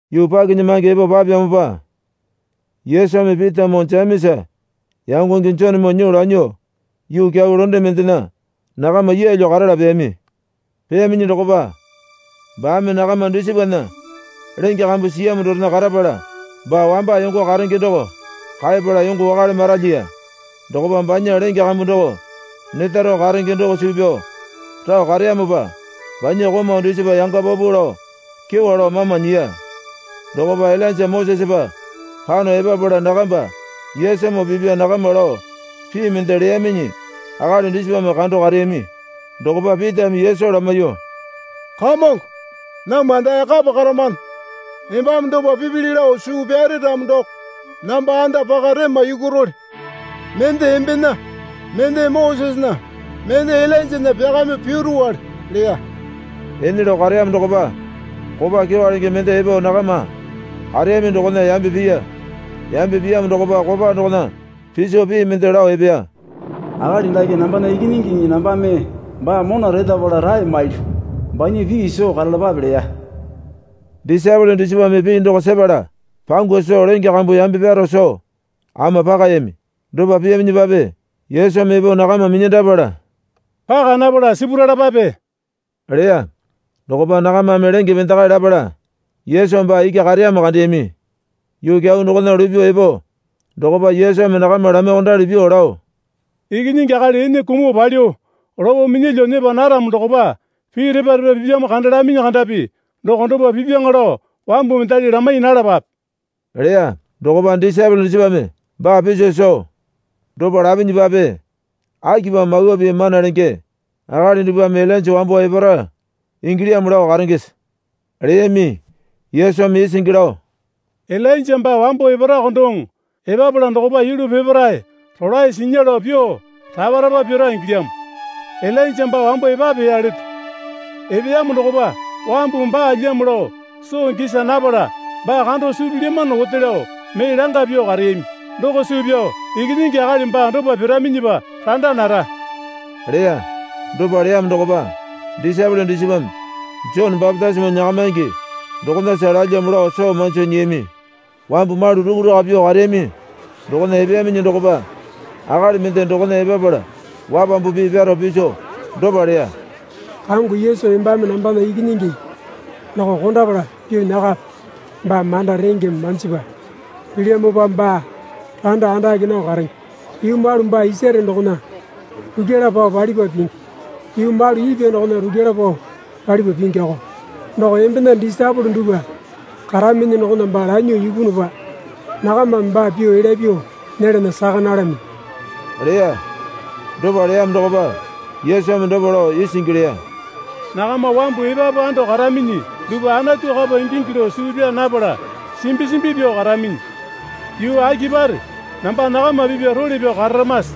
Yuu pakinyamange epo papeyamopa Yesumi Pitamoo Jemesa yangonge Jonemoo nyuo lanyuo yuu kyau londe mendena nakama yeelyo karala peyami. Peyaminyi dokopa baame nakama dusipana lenge kambu siyamo dorena karapala baa wamba yongo karenge doko kaepala yongo wakale maralyiya. Dokopa banya lenge kambu doko neta rao karenge doko suu pyao rao kareyamopa banya komau dusipa yanga paupau lao kyewa lao mama nyiya. Dokopa Ilainja Mosesepa pano epapala nakamba Yesumoo pipya nakama lao pii mende leyaminyi akali dusipame kando kareyami. Dokopa Pitame Yesu lamaiyuo, Kamongo, namwa dae kapa karamano. Embame dopa pipili lao suu pyare ramo doko namba anda paka rema yukurole. Mende embena mende Mosesena mende Ilainjana pyakamyuo piruwale, leya. Ene lao kareyamo dokopa kopa kyewa lenge mende epo nakama kareyami dokona yambe piya. Yambe piyamo dokopa kopa dokona piso pii mende lao epeya. Akali dake nambana Ikinyingiŋi nambame baa mona retapala rae mailyu. Banya pii soo karalapape, leya. Disaepole dusipame pii doko sepala pangu soo lenge kambu yambe pyaro soo ama pakayami. Dopa piyaminyipape Yesumi epo nakama minyandapala, Paka napala sipuralapape, leya. Dokopa nakamame lenge pendekae lapala Yesu baa iki kareyamo kandeyami. Yuu kyau dokona lupyuo epo dokopa Yesumi nakama lamaiyuokondali pyuo lao Ikinyingi Akali ene kumuo palyuo lopo minyalyuo nyepa naramo dokopa pii repa repa pipyamo kandalaminyi kandapi doko dopa pipyaŋa lao wambu mendali lamai nalapape, leya. Dokopa disaepole dusipame baa piso soo, Dopa lapinyipape, akipamo Mawa Pii mana lenge akali dupwame Ilainja wambo epara ingilyamo lao karengese? leyami. Yesumi isingi lao, Ilainja baa wambo eparako doŋo. Epapala dokopa yulu peparae rolae sinya lao pyuo rapa rapa pira ingilyamo. Ilainja baa wambo epapeya leto. Epeyamo dokopa wambumi baalyamo lao soo gisa napala baa kando suu pilyamano ote lao mee langa pyuo kareyami. Doko suu pyao Ikinyingi Akali baa dopa piraminyipa randa nara, leya. Dopa leyamo dokopa disaepole dusipame Jone bapitisimo nyakamaingi dokonasa lalyamo lao soo manjo nyiyami. Wambu malu rukuraka pyuo kareyami dokona epeyaminyi dokopa akali mende dokona epapala wapambu pii pyaro piso dopa leya. Kamongo, Yesu embame nambana ikinyingi doko kondapala pyuo nyakape. Baa manda rengeme manjipa pilyamopa baa randa andake nao karenge. Yuu malu baa isare dokona rukyala pao palipa pingi, yuu malu ipwa dokona rukyala pao palipa pingiko. Doko embena disaepole dupwa karaminyi dokona baa lanyuo ipunupa nakamame baa pyuo elya pyuo nyelana saka nalaminyi, leya. Dopa leyamo dokopa Yesumi dopa lao isingi leya. Nakama wambu epapu ando karaminyi dupwa Anatu kapa ingingi lao suu pyaa napala simbi simbi pyuo karaminyi. Yuu akipare namba nakama pipya role pyao kararamase?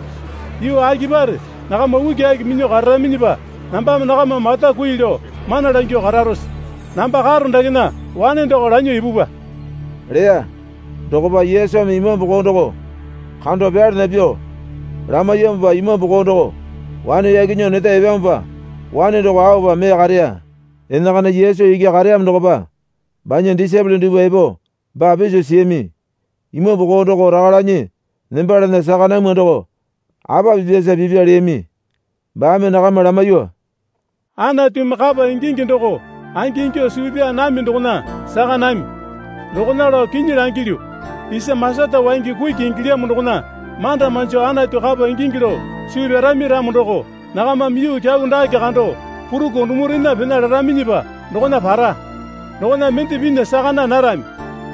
Yuu akipare nakama ukiaki minyuo kararaminyipa nambame nakama mata kui lao mana langyuo kararose? Namba karo dakena wane doko lanyuo ipupwa, leya. Dokopa Yesumi imambu koo doko kando pyalana pyuo lamaiyamopa imambu koo doko wane yaki nyuo neta epeyamopa wane doko aopa mee kareya. Enakana Yesu iki kareyamo dokopa banya disaepole dupwa epo baa piso siyami. Imambu koo doko raka lanyi nembalana saka namwa doko apa pipyasa pipya, leyami. Baame nakama lamaiyuo, Anatumi kapa ingingi doko angingyuo suu pyaa nami dokona saka nami. Dokona lao kinyi langilyu, isa masata waingi kuki ingilyamo dokona manda manju Anatu kapa ingingi lao suu pyarami ramo doko nakamame yuu kyau dake kando purukuo dumurena pena laraminyipa dokona para. Dokona mende pinya saka naa narami.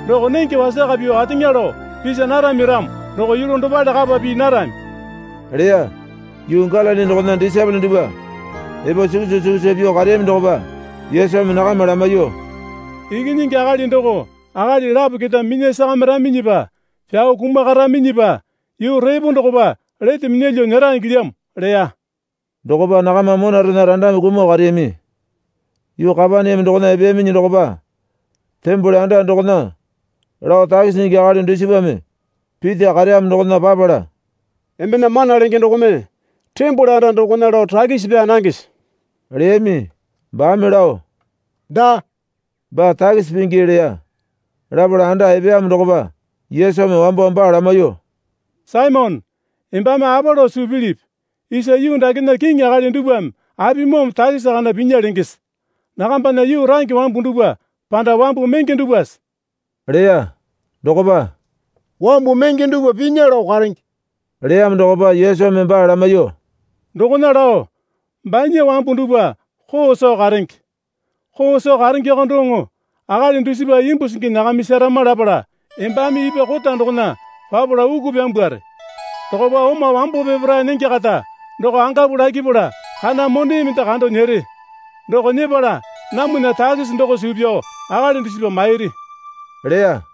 Doko nenge wasaka pyuo ateŋa lao pisa narami ramo doko yulu dopale kapa pii narami, leya. Yuu Galili dokona disaepole dupwa epo sukusa sukusa pyuo kareyami dokopa Yesumi nakama lamaiyuo, Ikinyingi Akali doko akali lapo keta minya sakamiraminyipa pyao kumakaraminyipa yuu repo dokopa lete minyalyuo nyera ingilyamo, leya. Dokopa nakama monarena randame kumuo kareyami. Yuu Kapaneame dokona epeyaminyi dokopa tembole anda dokona lao takisi nyingi akali dusipame Pita kareyamo dokona papala, Embena mana lenge dokome tembole anda dokona lao takisi pyaa nangese? leyami. Baame lao, Daa, baa takisi pingi, leya. Lapala anda epeyamo dokopa Yesumi wambo baa lamaiyuo, Saimone, embame apa lao suu pilipi? Isa yuu dakena kiŋi akali dupwame apimoome takisi kana pinya lengese? Nakambana yuu range wambu dupwa panda wambu menge dupwase? leya. Dokopa, Wambu menge dupwa pinya lao karenge, leyamo dokopa Yesumi baa lamaiyuo, Dokona lao banya wambu dupwa koo soo karenge. Koo soo karengeko doŋo akali dusipa imbu singi nyakamisarama lapala embame ipwa kota dokona papala uku pyambware. Dokopa oma wambo peparae nenge kata doko angapu lakipala kana mone mende kando nyere. Doko nyepala namwana takisi doko suu pyao akali dusipa mairi, leya.